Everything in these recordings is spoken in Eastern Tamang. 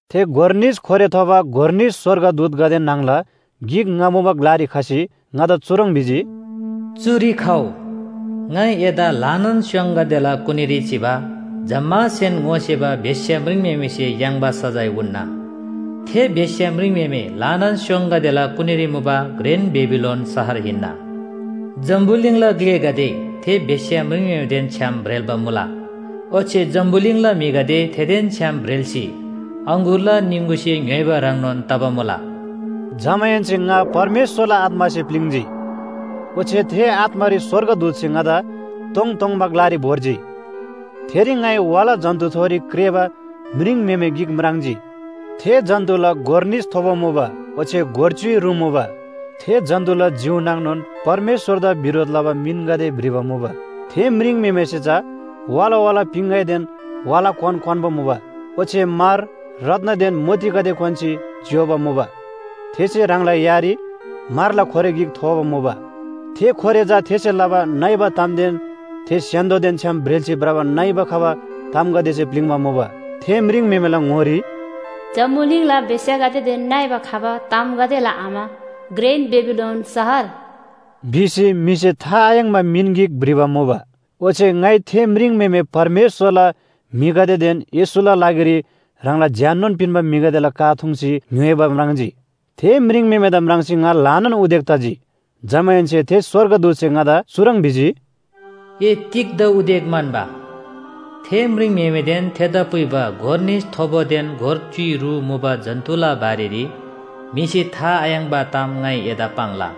थे गोर निस खोरे थोबा गोर निस स्‍वर्गदूतगदे न्‍हङला गिक ङा मुबा ग्‍लारी खसी ङादा चुह्रङ् भिजी, “चुरी खउ, ङाइ एदा ल्‍हानान स्‍योङगदेला कुनीरी चिबा जम्‍मासेन ङोसेबा बेश्‍या म्रिङम्‍हेमेसे याङ्बा सजाय उन्‍ना। थे बेश्‍या म्रिङम्‍हेमे ल्‍हानान स्‍योङगदेला कुनीरी मुबा घ्रेन बेबिलोन शहर हिन्‍ना। जम्‍बुलिङला ग्‍लेगदे थे बेश्‍या म्रिङम्‍हेमेदेन छ्‌याम ब्रेल्‍बा मुला। ओच्‍छे जम्‍बुलिङला म्‍हिगदे थेदेन छ्‌याम ब्रेल्‍सी अङगुरला निङगुसे ङ्‌य्‍होइबा ह्रङ्नोन तबा मुला। जमाहेन्‍से ङा परमेश्‍वरला आत्‍मासे प्‍लिङ्‌जी। ओच्‍छे थे आत्‍मारी स्‍वर्गदूतसे ङादा तोङतोङबा ग्‍लारी भोर्जी। थेरी ङाइ वाला जन्‍तुथोरी क्रेःबा म्रिङम्‍हेमे गिक म्राङ्जी। थे जन्‍तुला गोर निस थोबो मुबा ओच्‍छे गोर च्‍युइ रु मुबा। थे जन्‍तुला जिउ नाङनोन परमेश्‍वरदा बिरोध लबा मिनगदे भ्रिबा मुबा। थे म्रिङम्‍हेमेसे चा वाला वाला पिङगैदेन वाला क्‍वान क्‍वान्‍बा मुबा। ओच्‍छे म्‍हर, रत्‍नदेन मोतीगदे क्‍वान्‍सी ज्‍योबा मुबा। थेसे ह्राङला यारी म्‍हरला खोरे गिक थोबा मुबा। थे खोरे चा थेसे लबा नइबा तामदेन थे स्‍य्‍हान्‍दोदेन छ्‌याम ब्रेल्‍सी भ्रबा नइबा खबा तामगदेसे प्‍लिङ्बा मुबा। थे म्रिङम्‍हेमेला ङोरी, “जम्‍बुलिङला बेश्‍यागदेदेन नइबा खबा तामगदेला आमा घ्रेन बेबिलोन शहर” भिसी म्‍हिसे था आयाङ्‍बा मिन गिक भ्रिबा मुबा। ओच्‍छे ङाइ थे म्रिङम्‍हेमे परमेश्‍वरला म्‍हिगदेदेन येशूला लागिरी ह्राङला ज्‍याननोन पिन्‍बा म्‍हिगदेला का थुङ्सी ङ्‌य्‍होइबा म्राङ्जी। थे म्रिङम्‍हेमेदा म्राङ्सी ङा ल्‍हानान उदेक तजी। जमाहेन्‍से थे स्‍वर्गदूतसे ङादा चुह्रङ् भिजी, “ए तिग्‍दा उदेक म्‍हन्‍बा? थे म्रिङम्‍हेमेदेन थेदा पुइबा गोर निस थोबादेन गोर च्‍युइ रु मुबा जन्‍तुला बारेरी म्‍हिसे था आयाङ्‍बा ताम ङाइ एदा पाङ्ला।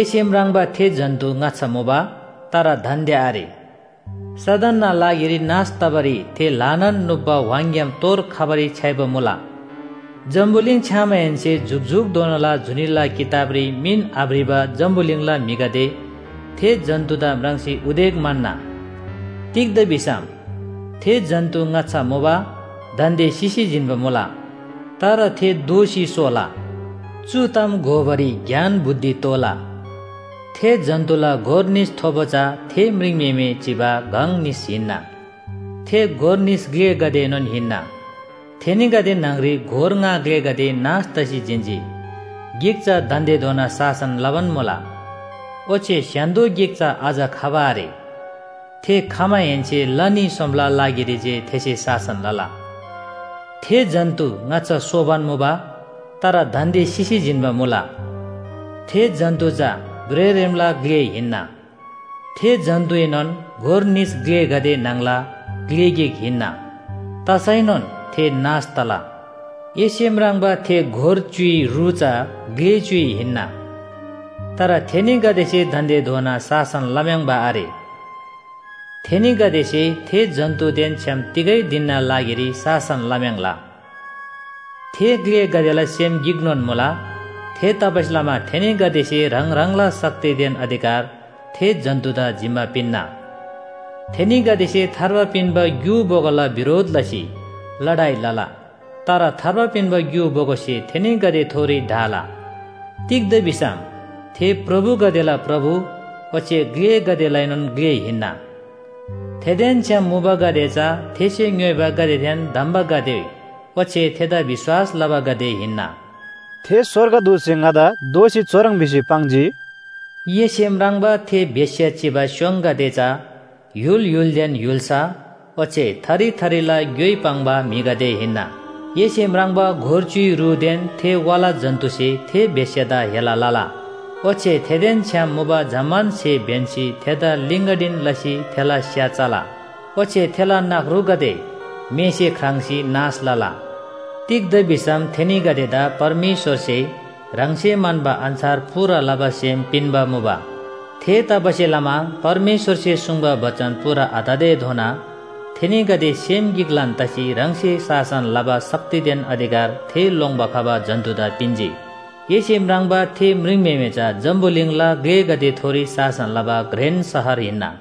एसे म्राङ्बा थे जन्‍तु ङाच्‍छा मुबा, तर दान्‍दे आरे। सदनना लागिरी नाश तबारी थे ल्‍हानान नुप्‍बा व्‍हाङग्‍याम तोर खबारी छ्‌याइबा मुला। जम्‍बुलिङ छ्‌यामाहेन्‍से जुकजुकधोनाला जुनीला किताबरी मिन आभ्रिबा जम्‍बुलिङला म्‍हिगदे थे जन्‍तुदा म्राङ्सी उदेक म्‍हन्‍ना। तिग्‍दा भिसम थे जन्‍तु ङाच्‍छा मुबा, दान्‍दे सिसी जिन्‍बा मुला। तर थे दोःसी सोला। “चु ताम घोबारी ज्ञान बुद्धि तोःला। थे जन्‍तुला गोर निस थोबो चा थे म्रिङम्‍हेमे चिबा गङ निस हिन्‍ना। थे गोर निस ग्‍लेगदेएनोन हिन्‍ना, थेनीगदे न्‍हङरी गोर ङा ग्‍लेगदे नाश तसी जिन्‍जी, गिक चा दान्‍देधोना शासन लबान मुला। ओच्‍छे स्‍य्‍हान्‍दो गिक चा अझ खबा आरे। थे खमाहेन्‍से ला न्‍ही सोमला लागिरी जे थेसे शासन लला। थे जन्‍तु ङाच्‍छा सोबान मुबा, तर दान्‍दे सिसी जिन्‍बा मुला। थे जन्‍तु चा भ्रेःरेमला ग्‍ले हिन्‍ना। थे जन्‍तुएनोन गोर निस ग्‍लेगदे न्‍हङला ग्‍ले गिक हिन्‍ना। तसैनोन थे नाश तला। “एसे म्राङ्बा थे गोर च्‍युइ रु चा ग्‍ले च्‍युइ हिन्‍ना। तर थेनीगदेसे दान्‍देधोना शासन लम्‍याङ्बा आरे। थेनीगदेसे थे जन्‍तुदेन छ्‌याम तिगै धिनना लागिरी शासन लम्‍याङ्ला। थे ग्‍लेगदेला सेम गिकनोन मुला। थेतबासेलमा थेनीगदेसे ह्राङ ह्राङला शक्तिदेन अधिकार थे जन्‍तुदा जिम्‍मा पिन्‍ना। थेनीगदेसे थार्बा पिन्‍बा ग्‍यु बोगोला बिरोध लसी लडाइ लला। तर थार्बा पिन्‍बा ग्‍यु बोगोसे थेनीगदेथोरी ढाला। तिग्‍दा भिसम थे प्रभुगदेला प्रभु ओच्‍छे ग्‍लेगदेलाएनोन ग्‍ले हिन्‍ना। थेदेन छ्‌याम मुबागदे चा थेसे ङ्‌योइबागदेदेन धम्‍बागदे ओच्‍छे थेदा विश्‍वास लबागदे हिन्‍ना।” थे स्‍वर्गदूतसे ङादा दोःसी चुह्रङ् भिसी पाङ्जी, “एसे म्राङ्बा थे बेश्‍या चिबा स्‍योङगदे चा य्‍हुल य्‍हुलदेन य्‍हुल्‍सा ओच्‍छे थरी थरीला ग्‍योइ पाङ्बा म्‍हिगदे हिन्‍ना। एसे म्राङ्बा गोर च्‍युइ रुदेन थे वाला जन्‍तुसे थे बेश्‍यादा हेला लला। ओच्‍छे थेदेन छ्‌याम मुबा जम्‍मान स्‍हे ब्‍यन्‍सी थेदा लिगन्‍डीन लसी थेला स्‍या चला। ओच्‍छे थेला नख्रुगदे मेसे ख्राङ्‌सी नाश लला। तिग्‍दा भिसम थेनीगदेदा परमेश्‍वरसे ह्राङसे म्‍हन्‍बा अन्‍छार पूरा लबा सेम पिन्‍बा मुबा। थेतबासेलमा परमेश्‍वरसे सुङ्बा बचन पूरा आततेधोना थेनीगदे सेम गिकलान तसी ह्राङसे शासन लबा शक्तिदेन अधिकार थे लोङ्‌बा खबा जन्‍तुदा पिन्‍जी। एसे म्राङ्बा थे म्रिङम्‍हेमे चा जम्‍बुलिङला ग्‍लेगदेथोरी शासन लबा घ्रेन शहर हिन्‍ना।”